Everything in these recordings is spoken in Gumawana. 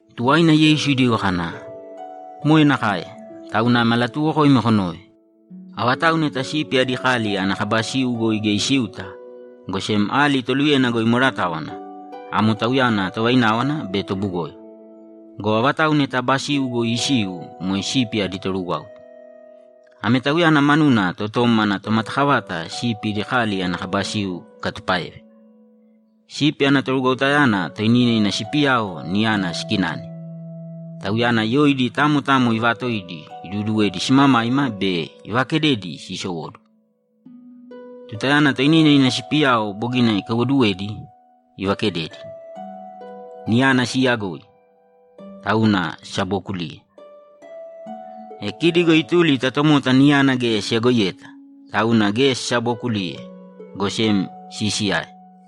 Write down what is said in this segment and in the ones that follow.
Tuwaina Yeisu idigo kana, ‘Moe nakae, tauna ame alatuuwokoimi konōve: Avatau neta sipi adi kali ana kaba siu goi geya isiuta, go sem ali toluyena goi imweratáwana, amo tauyana tovaináwana be tobugoyo. Go avatau neta aba siu goi isiu moe sipi adi torugwáuta. Ame tauyana manuna totom ana tomatakavata sipi idi kali ana kaba siu ikatupáeve. Sipi ana torugwautayana toinina ina sipiyao niyana sikinane; tauyana yoidi tamo tamo ivaatoidi iduuduwedi simamaima be ivaakededi siisowóduwo. Tutayana toinina ina sipiyao bogina ikaiwoduwedi, ivakededi. Niyana siiyagoi, tauna sisabookuliye. E kidi go ituli ta tomota niyana geya siyagoiyeta, tauna geya sisabookuliye, go sem siisiyae.’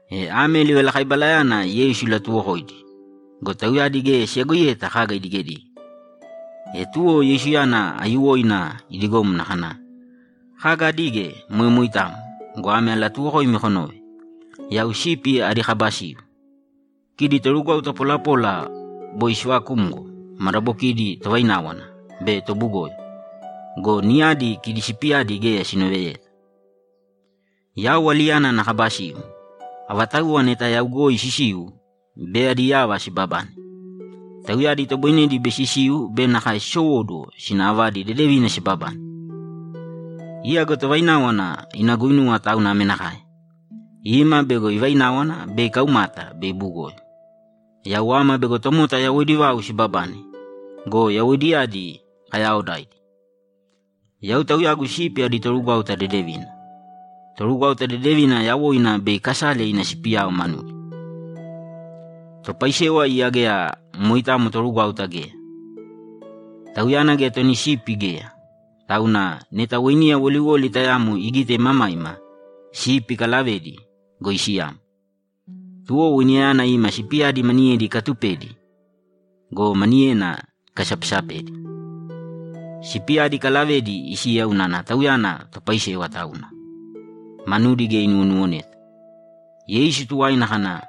E ame livalakaibalayana Yeisu ilatuwokoidi go, tauyadi geya siyagoiyeta kaga idigedige. E tuwo Yeisuyana aiyuwoina idigomna kana, ‘Kaga adige moe moitamo go, ame alatuuwokoimi konōve: Yau sipi adi kaba siu. Kidi torugwauta polapola boi siivakumgo madabokidi tovaináwana be tobugoyo go, niyadi kidi sipiyadi geya sinoveyeta. Yau aliyana ana kaba siu. Avatauwa neta yau goi sisiu, bei adi yava sibabane. Tauyadi itoboinedi bei sisiu be nakae sisowóduwo sina avadi dedevina sibabane. Iya go tovaináwana ina guinuwa tauna ame nakae: Ima bego ivaináwana be ikaumata be ibugoyo. Yau ama bego tomota yawoidi vau sibabane go, yawoidiyadi kayaaodaidi. Yau Tauyagu sipi adi torugwáuta dedevina. Torugwáuta dedevina yawoina bei ikasale ina sipiyao manudi. Topaisewa iya geya moitamo torugwáuta geya. Tauyana geya toni sipi geya, tauna neta weiniya woliwoli tayamo igite imamaima, sipi ikalavedi go, isiyamo. Tuwo weiniyayana ima sipiyadi maniyedi ikatupedi go, maniyedi ikasapesapedi. Sipiyadi ikalavedi isiya unana tauyana topaisewa tauna. Manudi geya inuwonuwoneta.’ Yeisu tuwaina kana,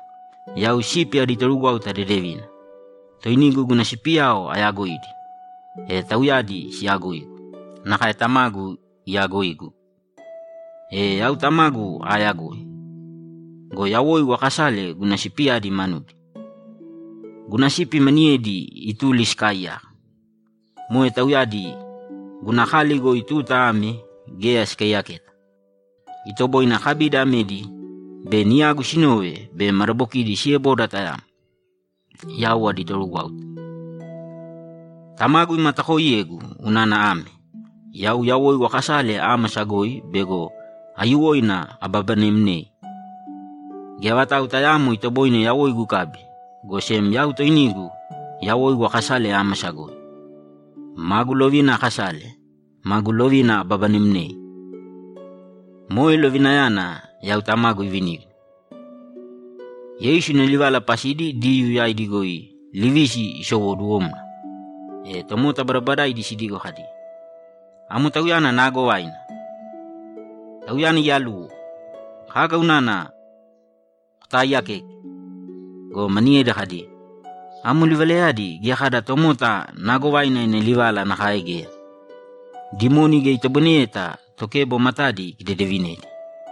‘Yau sipi adi torugwáuta dedevina. Toinigu guna sipiyao ayaagoidi, e tauyadi siyaagoigu nakae Tamagu iyaagoigu, e yau Tamagu aayagoi. Go yawoigu aakasale guna sipiyadi manudi. Guna sipi maniyedi ituli sikaaiyaka. Moe tauyadi guna kali goi tuta ame geya sikaiyaketa. Itoboine akabidi amedi bei niyagu sinove be madabokidi sieboda tayamo, yau adi torugwáuta. Tamagu imatakooiyegu unana ame: Yau yawoigu akasale ámasa goi bego aiyuwoina ababanemnei. Geya vatau tayaamo itoboine yawoigu ikabi, go sem yau toinigu yawoigu akasale ámasa goi. Magu lovina akasale, magu lovina ababanemnei. Moe lovinayana yau Tamagu ivinigu.’ Yeisu ina livala pasidi Diyuu yaidi goi livisi isowoduwomna. E tomota badabadaidi sidigo kadi, ‘Amo tauyana naagovaina! Tauyana iyaluwo! Kaga unana kotaaiyakeke?’ Go maniyedi kadi, ‘Amo livalayadi geya kada tomota naagovaina ina livala nakae geya. Dimoni geya itoboineyeta tokebo matadi ikidedevinedi!’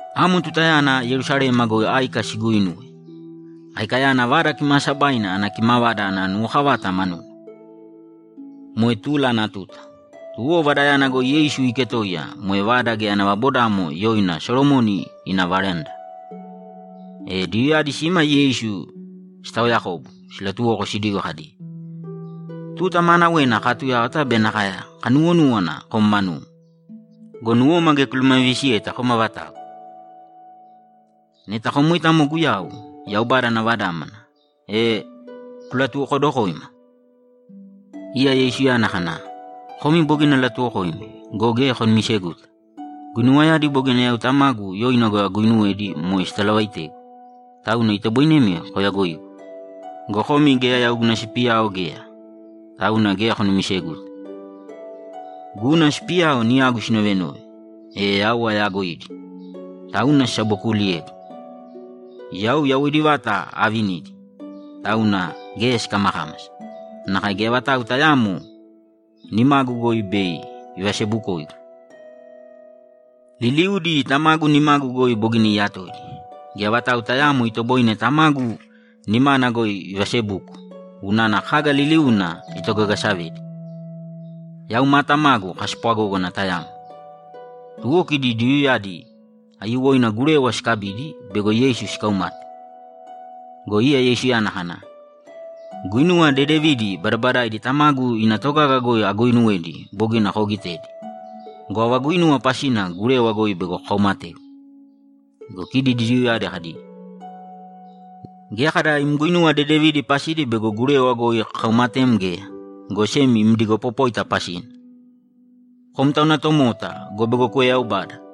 Amo tutayana Yerusalema goi áika siguinuwe; aikayana Vada Kimaasabaina ana kimavada ana nuwokavata manuna. Moe tula ana tuta. Tuwo Vadayana goi Yeisu iiketoiya moe vada geya ana vabodamo yoina Solomoni ina veranda. E Diyuuyadi sima Yeisu sitaoyakobu silatuwoko sidigo kadi, ‘Tuta maanawena kaatuyáwata be nakae kanuwonúwana kom manum go, nuwoma geya kulumavivisiyeta kom avatau. Neta kom moitamo Guyau, Yaubada ana Vadámana, e kulatuwokodokōima!’ Iya Yeisuyana kana, ‘Komi bogina alatuwokoimi go, geya konumiseguta. Guinuwayadi bogina yau Tamagu yoina goi aguinuwedi moe sitalavaitegu, tauna itoboinemi koyagoigu. Go komi geya yau guna sipiyao geya, tauna geya konumiseguta. Guna sipiyao niyagu sinovenove, e yau ayaagoidi, tauna sisabokuuliyegu. Yau yawoidi vata aavinidi, tauna geya sikamakámasa nakae geya vatau tayaamo nimagu goi bei ivasebukoigu. Liliudi Tamagu nimagu goi bogina iyatoidi. Geya vatau tayaamo itoboine Tamagu nimana goi ivasebuko unana kaga liliuna itogagasavedi. Yau ma Tamagu kaspwagógana tayamo.’ Tuwo kidi Diyuuyadi aiyuwoina gurewa sikabidi bego Yeisu sikaumate. Go iya Yeisuyana kana, ‘Guinuwa dedevidi badabadaidi Tamagu ina togaga goi aguuinuwedi bogina koogitedi go, ava guinuwa pasina gurewa goi bego kokaumategu?’ Go kidi Diyuuyadi kadi, ‘Geya kada im guinuwa dedevidi pasidi bego gurewa goi kakaumatem geya, go sem im digopopóita pasina. Kom tauna tomota go, bego kueyaubada!’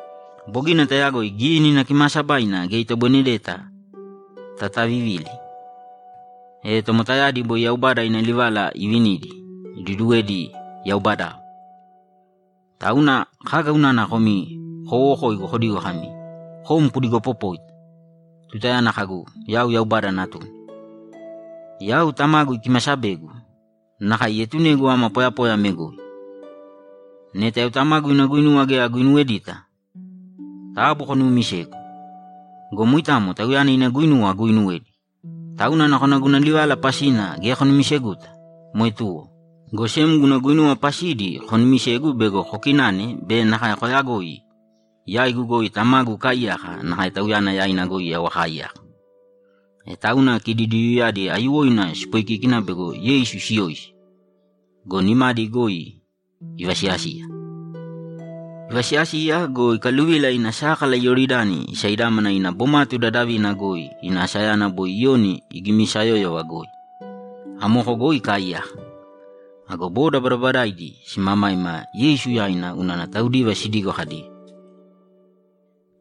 Bogina tayagoi Gínina Kimaasabaina geya itoboinedeta tatavivili. E tomotayadi boi Yaubada ina livala ivinidi, iduduwedi yaubadao, tauna kaga unana komi kowowokoigu kodigo kami, “Kom kudigoopopóita”, tutayana kagu, “Yau Yaubada Natuna”? Yau Tamagu ikimasabegu nakae ietunegu ama poyapoya ame goi. Neta yau Tamagu ina guinuwa geya aguinuwedita, taabu konuumisēgu. Go moitamo Tauyana ina guinuwa aguuinuwedi, tauna nakona guna livala pasina geya konumiseguta, moe tuwo, go sem guna guinuwa pasidi konumisēgu bego kokinane be nakae koyagoi yaigu goi Tamagu ikaaiyaka nakae Tauyana yaina goi yau akaaiyaka.’ E tauna kidi Diyuuyadi aiyuwoina sipoikíkina bego Yeisu siyoisi go, nimadi goi ivasiyasiya. Ivasiyasiya go, ikaluvila ina sákala Iyoridani isaidámana ina bomatu dadavina goi ina asayana boi Iyoni igimisayóyova goi. Amoko goi ikaaiyaka. Ago boda badabadaaidi simamaima Yeisu yaina unana taudiva sidigo kadi,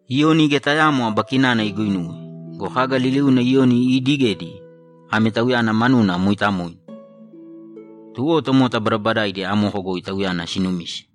‘Iyoni geya tayaamo aba kinana iguinuwe go, kaga liliuna Iyoni iidigedi ame Tauyana manuna mooitamoina!’ Tuwo tomota badabadaidi amoko goi Tauyana sinumise.